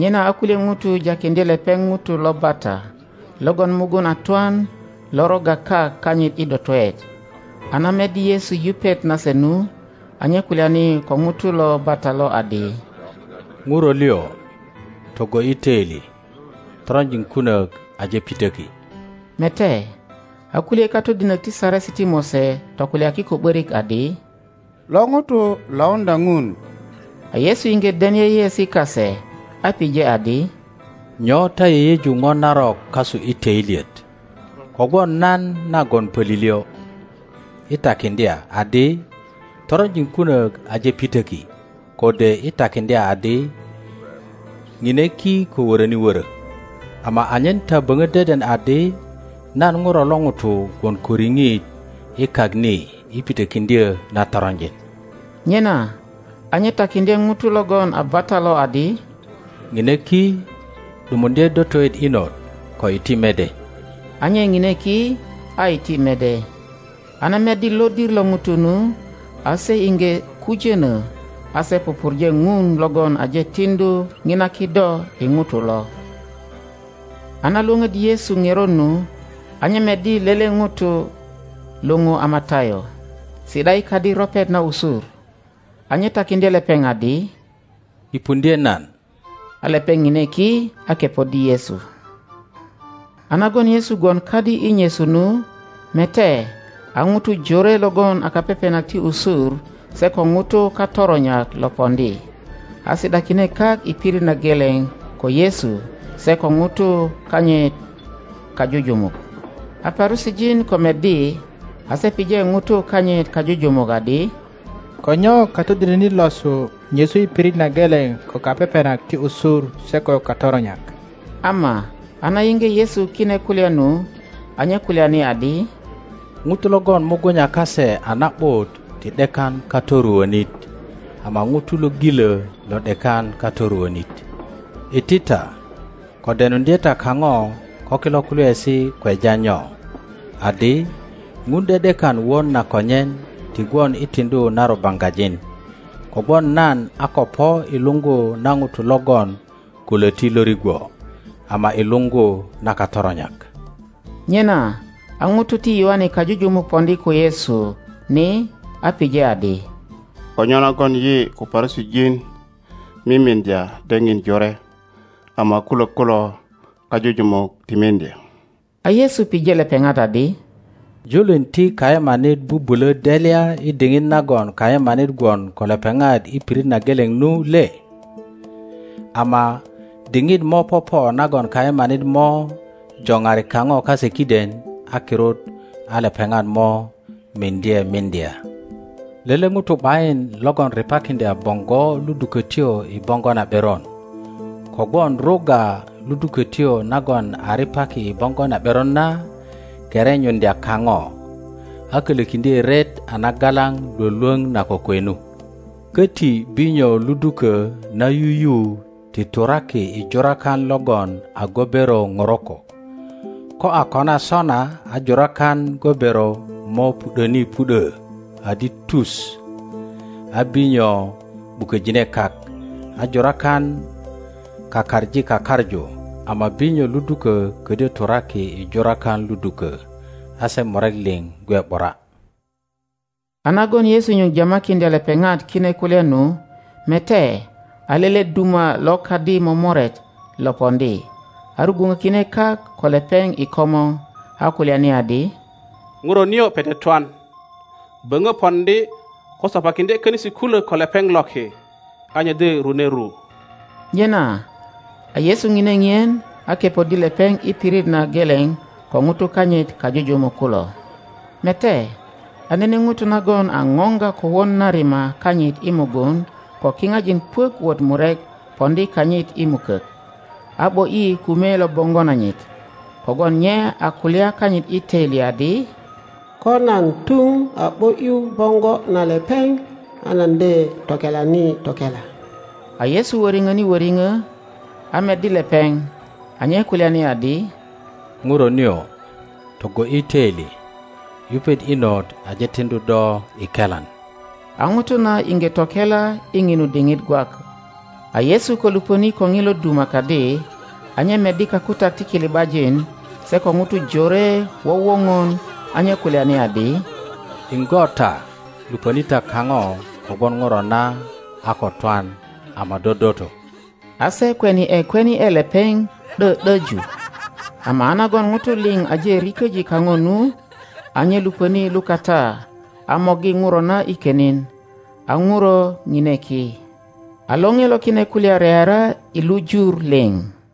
Nyena a kulye ŋutu jakiŋdye lepeŋ ŋuto lo bata logon mugun a twan lo rogga kak kanyit i dotoet, a na meddi Yesu yupet nase nu, a nye kulyani ko ŋuto lo bata lo adi, Ŋuro liŋ, togo ’yi toili, toronjin kunok aje pitöki. Mete, a kulye katodinok ti Saresi ti Mose tokulyaki ko ’borik adi, Lo ŋuto lauŋdya Ŋun. A Yesu iŋge den yeyeesi kase, a pije adi, Nyo ta yeyeju ŋo narok kasu i töilyet? Kogwon nan nagon pölilyö, i takiŋdya adi, Toronjin kunok aje pitöki, kode i takiŋdya adi, Ŋine ki ko woroni wörö? Ama anyen ta böŋo deden adi nan ŋuro lo ŋuto gwon ko riŋit i kak ni i pitokiŋdyö na toronjin— nyena a nye takiŋdye ŋuto logon a bata lo adi—ŋine ki, ’dumuŋdye dotoet inot, ko iti mede. A nye ŋine ki, a iti mede. A na meddi lodir lo ŋutu nu, a se iŋge kujono, a se pupurje Ŋun logon aje tiŋdu ŋina kido i ŋutu lo. A na Iwoŋoddi Yesu ŋerot nu. a nye meddi lele ŋuto luŋu a Matayo, si ’da i kadi ropet na usur, a nye takiŋdye lepeŋ adi, Kipuŋdye nan. A lepeŋ ŋine ki a kepoddi Yesu. A nagon Yesu gwon kadi i nyesu nu, mete, a ŋutu jore logon a kapepenak ti usur se ko ŋutu katoronyak lo poŋdi, a si ’dakine kak i pirit na geleŋ ko Yesu se ko ŋutu kanyit kajujumuk. A Parusijin ko meddi, a se pije ŋutu kanyit kajujumuk adi, Ko nyo katodinonit losu nyesu i pirit na geleŋ ko kapepenak ti usur se ko katoronyak? Ama a na yiŋge Yesu kine kulya nu, a nye kulyani adi, Ŋutu logon mugunya kase a na ’but ti ’dekan katoruonit, ama ŋutu lo ŋilo lo ’dekan katoruonit. Iti ta, ko denuŋdye ta kaŋoko kilo kulyaesi kweja nyo, adi, Ŋun ’de ’dekan won na konyen ti gwon i tiŋdu na rubaŋgajin. Kogwon nan a ko po i luŋgu na ŋutu logon ko Loti lo rigwo, ama i luŋgu na katoronyak. Nyena a ŋutu ti Yoane kajujumuk poŋdi ko Yesu ni, a pije adi, Ko nyo nagon yi ko Parusijin mimiŋdya daŋin jore, ama kulok kulo kajujumuk ti miŋdya? A Yesu pije lepeŋat adi, Julin ti kayemanit bubulo delya i diŋit nagon kayemanit gwon ko lepeŋat i pirit na geleŋ nu le? Ama diŋit mo popo nagon kayemanit mo joŋari kaŋo kase kiden, a kirut a lepeŋat mo miŋdye miŋdya. Lele ŋuto ’bayin logon ripakiŋdya boŋgo ludukotyo i boŋgo na ’beron, kogwon rugga ludukotyo nagon a ripaki i boŋgo na ’beron na kerenyuŋdya kaŋo, a kolokiŋdye ret a nagalaŋ Iwolwoŋ na kokwe nu. Koti binyo luduko na yuyu ti turaki i jurakan logon a gobero ŋoroko; ko a kona sona, a jurakan gobero mo pu ’doni pu ’do adi tu, a binyo ’buköjine kak, a jurakon kakaŋi kakaŋu; ama binyo luduko kodyö turaki i jurakan ludukö, a se murek liŋ gwe ’bura. A nagon Yesu nyuŋ jamakiŋdya lepeŋat kine kulya nu, mete, a lele duma lo kadi momoret lo poŋdi, a rugwuŋokine kak ko lepeŋ i komor, a kulyani adi, ŋuro nio pete twan; böŋö poŋdi ko sopakiŋdye konisi kulok ko lepeŋ loki, a nye de rune ru. Nyena a Yesu ŋine ŋien, a kepoddi lepeŋ i pirit na geleŋ ko ŋutu kanyit kajujumuk kulo. Mete, a nene ŋuto nagon a ŋöŋga kowon na rima kanyit i mugun ko kiŋajin puök wot murek poŋdi kanyit i mukok, a ’bo ’yi kume lo boŋgo nanyit; kogwon nye a kulya kanyit i töili adi, Ko nan tuŋ a ’bo ’yu boŋgo na lepeŋ. A nan de tokelani tokela. a Yesu woriŋoni woriŋo, a meddi lepeŋ, a nye kulyani adi, Ŋuro nio, togo ’yi toili! Yupet inot aje tiŋdu do i kelan. A ŋuto na iŋge tokela i ŋinu diŋit gwak. A Yesu ko luponi ko ŋilo duma kadi, a nye meddi kakutak ti kili ’bajin se ko ŋutu jore wowoŋon, a nye kulyani adi, Iŋgo ta, luponi ta kaŋo, kogwon ŋuro na a ko twan, ama dodoto. A se kweni ’e kwenie lepeŋ ’do ’doju. Ama a nagon ŋutu liŋ aje riköji kaŋo nu, a nye luponi lukata a morgi ŋuro na i konin, a ŋuro ŋine ki. A lore lo kine kulya reara i lu Jur liŋ.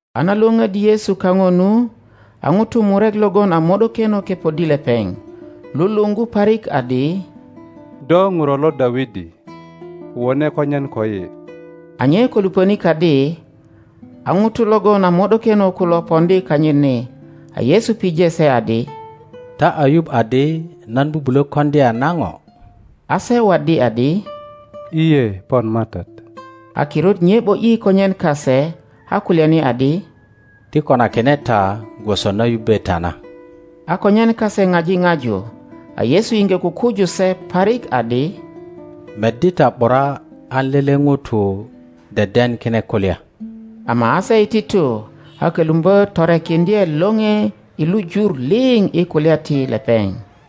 A na Iwoŋoddi Yesu kaŋo nu, a ŋutu murek logon a mo ’dokeno kepoddi lepeŋ, luluŋgu parik adi, Do ŋuro lo Dawidi, wone konyen koyi. A nye ko luponi kadi, a ŋutu logon a mo ’dokeno kulo poŋdi kanyit ni, a Yesu pije se adi, Ta a yuŋ adi nan bubulo koŋdya na ŋo? A se waddi adi, Jye, pon MATAT. a kirut nye ’bo ’yi konyen kase, a kulyani adi, Ti konakine ta gwoso na yubbe ta na. a konyen kase ŋaji ŋaju. A Yesu iŋge kukuju se parik adi, Meddi ta ’bura an lele ŋuto deden kine kulya. Ama a se iti tu, a kölumbö torekiŋdye lore i lu jur liŋ i kulya ti lepeŋ.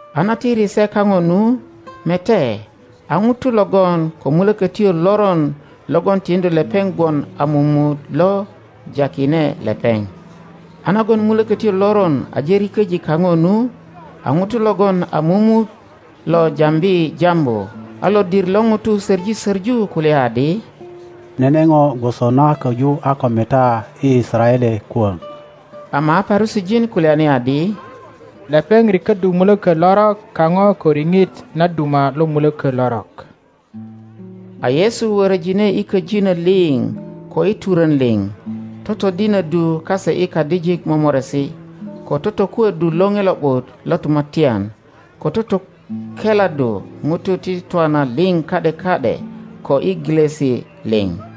A na tiri se kaŋo nu, mete, a ŋuto logon ko mulökötyo loron logon tiŋdu lepeŋ gwon a mumut lo jakine lepeŋ. A nagon mulökötyo loron aje riköji kaŋo nu, a ŋuto logon a mumut lo jambi jambu. A lodir lo ŋutu soŋi soŋu kulya adi, Nene ŋo gwoso na koju a ko meta i Yisaraele kwoŋ. Ama a Parusijin kulyani adi, Lepeŋ rikoddu mulökö lorok kaŋo ko riŋit na duma lo muloko lorok. A Yesu worojine i köjino liŋ ko i turon liŋ, totodinoddu kase i kadijik momoresi. ko totokuoddu Loŋe Lo ’but lo Tumatyan, ko totokeladdu ŋutu i twana liŋ ka ’de ka ’de ko i gilosi liŋ.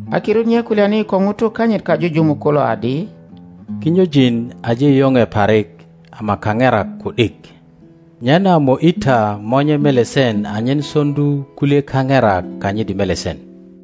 a kirut nye kulyani ko ŋutu kanyit kajujumuk kulo adi, Kinyojin aje yoŋe parik, ama kaŋerak ku ’dik, Nyena mo ’yi ta Monye melesen anyen soŋdu kulye kaŋerak kanyit i melesen.